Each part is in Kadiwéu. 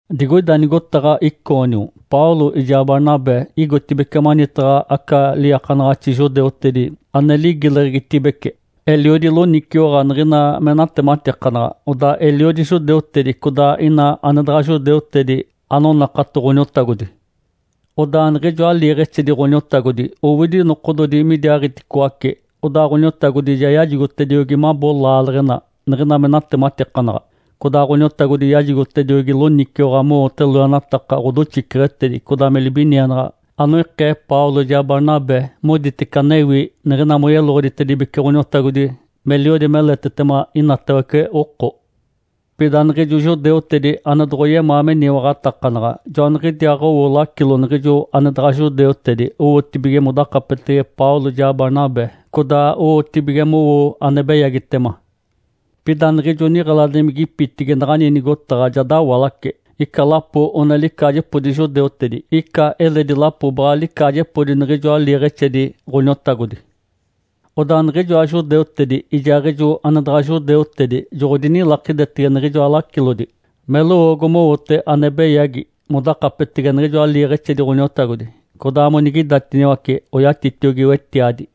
Digoida nigotaɡ̶a Icônio Paulo ijaa Barnabé igotibeci manitaɡ̶a aca liiakanaɡ̶axi judeutedi ane ligileɡ̶egitibece. Eliodi loniciwaɡ̶a niɡ̶ina me natematikanaɡ̶a, odaa eliodi judeutedi codaa ina ane daɡ̶a judeutedi anonakato Ǥoniotagodi. Odaa niɡ̶ijoa liiɡ̶exedi Ǥoniotagodi owidi nokododi midiaaɡ̶iticoace, odaa Ǥoniotagodi ja yajigotediogi mabo laaleɡ̶ena niɡ̶ina me natematikanaɡ̶a. Codaa Ǥoniotagodi yajigotediogi loniciwaɡ̶a mowote loenataka ɡ̶odoxiceɡ̶etedi codaa me libinienaɡ̶a anoikee Paulo ijaa Barnabé moditece anewi niɡ̶ina moyeloɡ̶oditibece Ǥoniotagodi meliodi meletetema inatawece oko. Pida niɡ̶ijo judeutedi ane doɡ̶oyemaa meniwaɡ̶atakanaɡ̶a joaniɡ̶idiaaɡ̶owo lacilo niɡ̶ijo ane daɡ̶a judeutedi owotibige modakapetege Paulo ijaa Barnabé, codaa owotibige mowo ane beyagitema. Pida niɡ̶ijo niɡ̶eladimigipitigi naɡ̶ani nigotaɡ̶a ja dawalace. Ica lapo one licaajepodi judeutedi, ica eledi lapo baɡ̶a licaajepodi niɡ̶ijoa liiɡ̶exedi Ǥoniotagodi. Odaa niɡ̶ijoa judeutedi ijaaɡ̶ijo ane daɡ̶a judeutedi joɡ̶odinilakidetege niɡ̶ijoa lacilodi me lowoogo mowote ane beyagi modakapetege niɡ̶ijoa liiɡ̶exedi Ǥoniotagodi, codaa monigidatiniwace oyatitiogi wetiadi.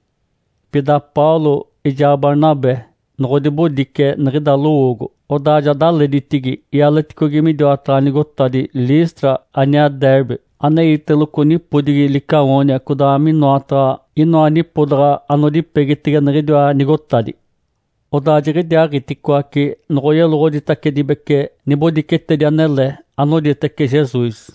Pida Paulo ijaa Barnabé noɡ̶odibodice niɡ̶ida lowoogo, odaa ja daleditigi ialeticogi midiwataɡ̶a nigotadi Listra aniaa Derbe aneiteloco nipodigi Licaônia codaa minoataɡ̶a inoa nipodaɡ̶a anodipegitege niɡ̶idiwa nigotadi. Odaa jiɡ̶idiaaɡ̶iticoace noɡ̶oyeloɡ̶oditacedibece nibodicetedi anele anoditece Jesus.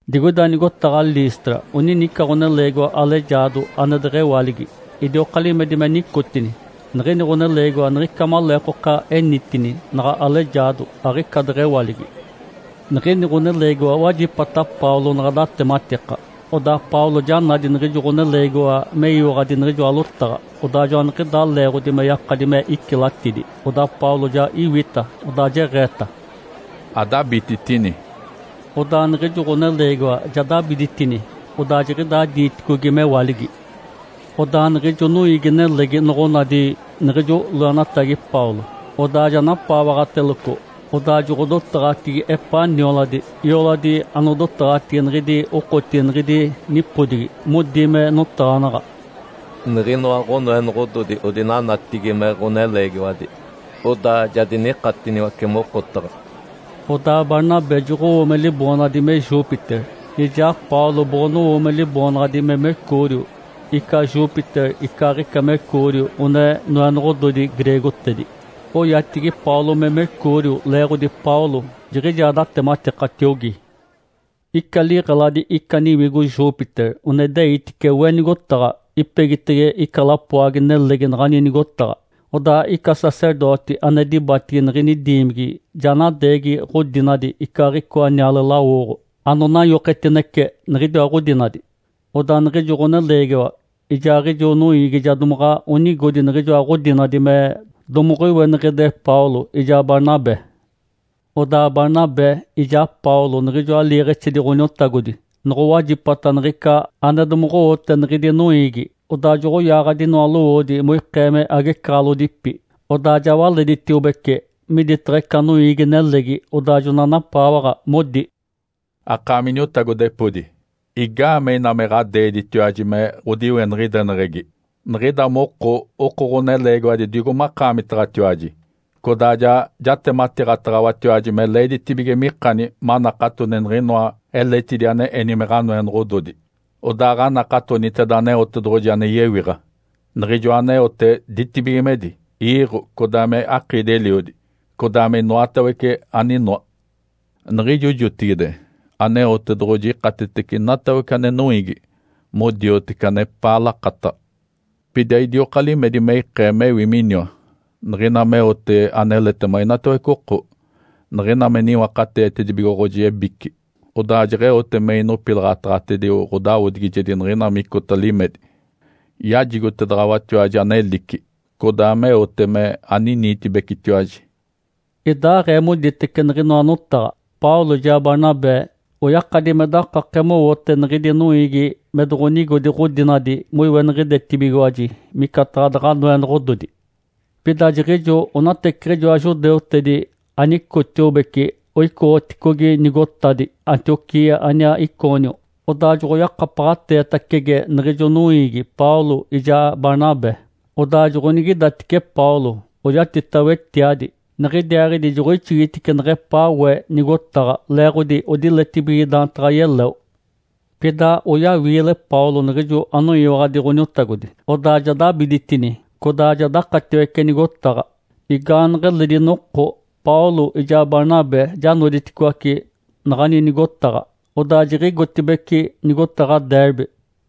Digoida nigotaɡ̶a Listra onini ica ɡ̶oneleegiwa alejaado ane deɡ̶ewaligi, idioka limedi me nicotini. Niɡ̶ini ɡ̶oneleegiwa niɡ̶ica maleekoka enitini naɡ̶a alejaado, aɡ̶ica deɡ̶ewaligi. Niɡ̶ini ɡ̶oneleegiwa wajipata Paulo naɡ̶a datematika. Odaa Paulo ja nadi niɡ̶ijo ɡ̶oneleegiwa meyiwaɡ̶adi niɡ̶ijoa lotaɡ̶a, odaa joaniɡ̶idaa leeɡ̶odi me yakadi me icilatidi. Odaa Paulo ja iwita, odaa jeɡ̶eeta, “Adabititini!” Odaa niɡ̶ijo ɡ̶oneleegiwa ja dabiditini, odaa jiɡ̶idaa diiticogi mewaligi. Odaa niɡ̶ijo noiigi-nelegi noɡ̶onadi niɡ̶ijo loenatagi Paulo, odaa ja napaawaɡ̶ateloco, odaa joɡ̶odotaɡ̶atigi epaa nioladi, ioladi anodotaɡ̶atigi niɡ̶idi okotigi niɡ̶idi nipodigi, modi me notaɡ̶anaɡ̶a, “Niɡ̶inoa ɡ̶onoenoɡ̶ododi odinanatigi me ɡ̶oneleegiwadi, odaa ja dinikatiniwace mokotaɡ̶a!” Odaa Barnabé joɡ̶owo me liboonaɡ̶adi me Júpiter, ijaa Paulo boɡ̶onowo me liboonaɡ̶adi me Mercúrio. (Ica Júpiter icaaɡ̶ica Mercúrio one noenoɡ̶ododi greegotedi.) Oyatigi Paulo me Mercúrio leeɡ̶odi Paulo jiɡ̶ijaa datematikatiogi. Ica liɡ̶eladi ica niwigo Júpiter one ideitice we nigotaɡ̶a, ipegitege ica lapoagi-nelegi naɡ̶ani nigotaɡ̶a. Odaa ica sacerdoti ane dibatigi niɡ̶ini diimigi ja nadeegi ɡ̶odinadi icaaɡ̶icoa niale-lawoɡ̶o anonanyoketinece niɡ̶idiwa ɡ̶odinadi. Odaa niɡ̶ijo ɡ̶oneleegiwa ijaaɡ̶ijo noiigi ja domaɡ̶a onigodi niɡ̶ijoa ɡ̶odinadi me domoɡ̶oiweniɡ̶ide Paulo ijaa Barnabé. Odaa Barnabé ijaa Paulo niɡ̶ijoa liiɡ̶exedi Ǥoniotagodi noɡ̶owajipata niɡ̶ica ane domoɡ̶owote niɡ̶idi noiigi, odaa joɡ̶oyaaɡ̶adi inoa lowoodi moikee me agecaɡ̶alodipi, odaa ja waleditiobece miditaɡ̶a ica noiigi-nelegi, odaa jona napaawaɡ̶a, modi, “Akaami iniotagodepodi, igaamee ina me ɡ̶adeeditiwaji me ɡ̶odiweniɡ̶ideneɡ̶egi? Niɡ̶ida moko oko ɡ̶oneleegiwadi digo makaamitaɡ̶atiwaji, codaa ja jatematiiɡ̶ataɡ̶awatiwaji me leeditibige mikani manakatoni niɡ̶inoa eletidi ane eni me ɡ̶anoenoɡ̶ododi, odaaɡ̶anakatoniteda Aneotedoɡ̶oji ane yewiɡ̶a, Niɡ̶ijoa aneote ditibigimedi, iiɡ̶o, codaa me akiidi-eliodi, codaa me inoatawece aninoa. Niɡ̶ijo jotigide Aneotedoɡ̶oji ikatetece inatawece ane noiigi modioteci anepaa lakataɡ̶a. Pida idioka limedi me ikee mewi miniwa, niɡ̶ina meote aneletema inatawece oko, niɡ̶ina me niwakateetedibigoɡ̶oji ebici, odaa jeɡ̶eote me inopilaɡ̶ataɡ̶atedio ɡ̶odawodigijedi niɡ̶ina micota limedi. Yajigotedaɡ̶awatiwaji anelici, codaa meote me aniniitibecitiwaji.” Idaaɡ̶ee moditece niɡ̶inoa notaɡ̶a, Paulo ijaa Barnabé oyakadi me dakake mowote niɡ̶idi noiigi me doɡ̶onigodi ɡ̶odinadi moiweniɡ̶idetibigiwaji micataɡ̶a daɡ̶a noenoɡ̶ododi. Pida jiɡ̶ijo onateciɡ̶ijoa judeutedi anicotiobece oicoɡ̶oticogi nigotadi Antioquia aniaa Icônio. Odaa joɡ̶oyakapaɡ̶ateetacege niɡ̶ijo noiigi Paulo ijaa Barnabé. Odaa joɡ̶onigidatice Paulo, oyatita wetiadi, niɡ̶idiaaɡ̶idi joɡ̶oixigitice neɡ̶epaa we nigotaɡ̶a, leeɡ̶odi odiletibige daantaɡ̶a yeleo. Pida oyawiile Paulo niɡ̶ijo anoyiwaɡ̶adi Ǥoniotagodi, odaa ja dabiditini, codaa ja dakataciwece nigotaɡ̶a. Igaaneɡ̶eledi noko Paulo ijaa Barnabé ja noditicoaci naɡ̶ani nigotaɡ̶a, odaa jiɡ̶igotibeci nigotaɡ̶a Derbe.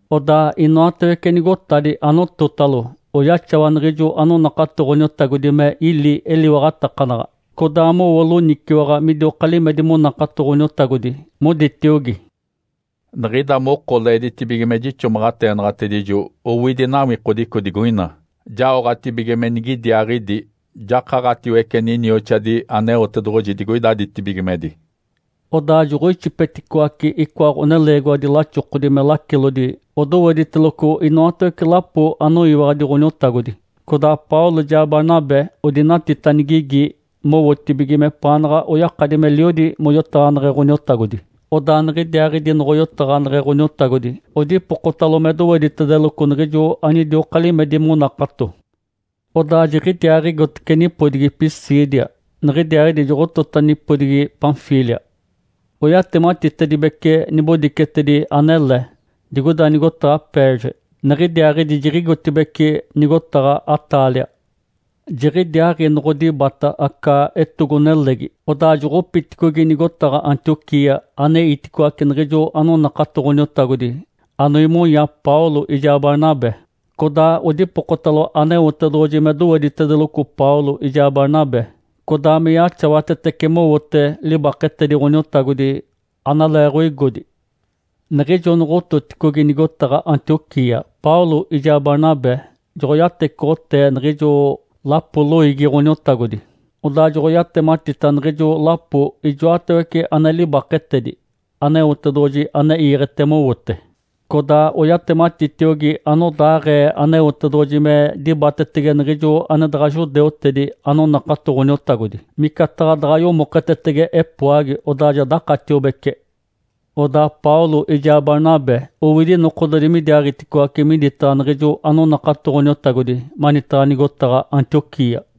Odaa inoatawece nigotadi anototalo oyaxawa niɡ̶ijo anonakato Ǥoniotagodi me ili eliwaɡ̶atakanaɡ̶a codaa mowo loniciwaɡ̶a midioka limedi monakato Ǥoniotagodi, moditiogi, “Niɡ̶ida moko leeditibige me jixomaɡ̶ateenaɡ̶atedijo owidi nawikodico digoina jaoɡ̶atibige me nigidiaaɡ̶idi jakaɡ̶atiwece ninioxadi Aneotedoɡ̶oji digoida ditibigimedi.” Odaa joɡ̶oixipeticoace icoa ɡ̶oneleegiwadi laxokodi me lacilodi odowediteloco inoatawece lapo anoyiwaɡ̶adi Ǥoniotagodi. Codaa Paulo ijaa Barnabé odinatita nigigi mowotibige mepaanaɡ̶a oyakadi meliodi moyotaɡ̶aneɡ̶e Ǥoniotagodi, odaa niɡ̶idiaaɡ̶idi noɡ̶oyotaɡ̶aneɡ̶e Ǥoniotagodi, odipokotalo me doweditedeloco niɡ̶ijo anidioka limedi monakato. Odaa jiɡ̶idiaaɡ̶igotece nipodigi Pisídia, niɡ̶idiaaɡ̶idi joɡ̶otota nipodigi Panfília. Oyatematitedibece nibodicetedi anele digoida nigotaɡ̶a Perge, niɡ̶idiaaɡ̶idi jiɡ̶igotibeci nigotaɡ̶a Atália. Jiɡ̶idiaaɡ̶i noɡ̶odibata aca etogo-nelegi, odaa joɡ̶opiticogi nigotaɡ̶a Antioquia, aneiticoace niɡ̶ijo anonakato Ǥoniotagodi anoimonya Paulo ijaa Barnabé, codaa odipokotalo Aneotedoɡ̶oji me doweditedeloco Paulo ijaa Barnabé, codaa me yaxawatetece mowote libaketedi Ǥoniotagodi analeeɡ̶oigodi. Niɡ̶ijo noɡ̶ototicogi nigotaɡ̶a Antioquia, Paulo ijaa Barnabé joɡ̶oyatecoɡ̶otee niɡ̶ijo lapo loiigi Ǥoniotagodi, odaa joɡ̶oyatematita niɡ̶ijo lapo ijoatawece ane libaketedi Aneotedoɡ̶oji ane iiɡ̶ete mowote, codaa oyatematitiogi anodaaɡ̶ee Aneotedoɡ̶oji me dibatetege niɡ̶ijo ane daɡ̶a judeutedi anonakato Ǥoniotagodi, micataɡ̶a daɡ̶a yomoketetege epoagi odaa ja dakatiobece. Odaa Paulo ijaa Barnabé owidi nokododi midiaaɡ̶iticoace miditaɡ̶a niɡ̶ijo anonakato Ǥoniotagodi manitaɡ̶a nigotaɡ̶a Antioquia.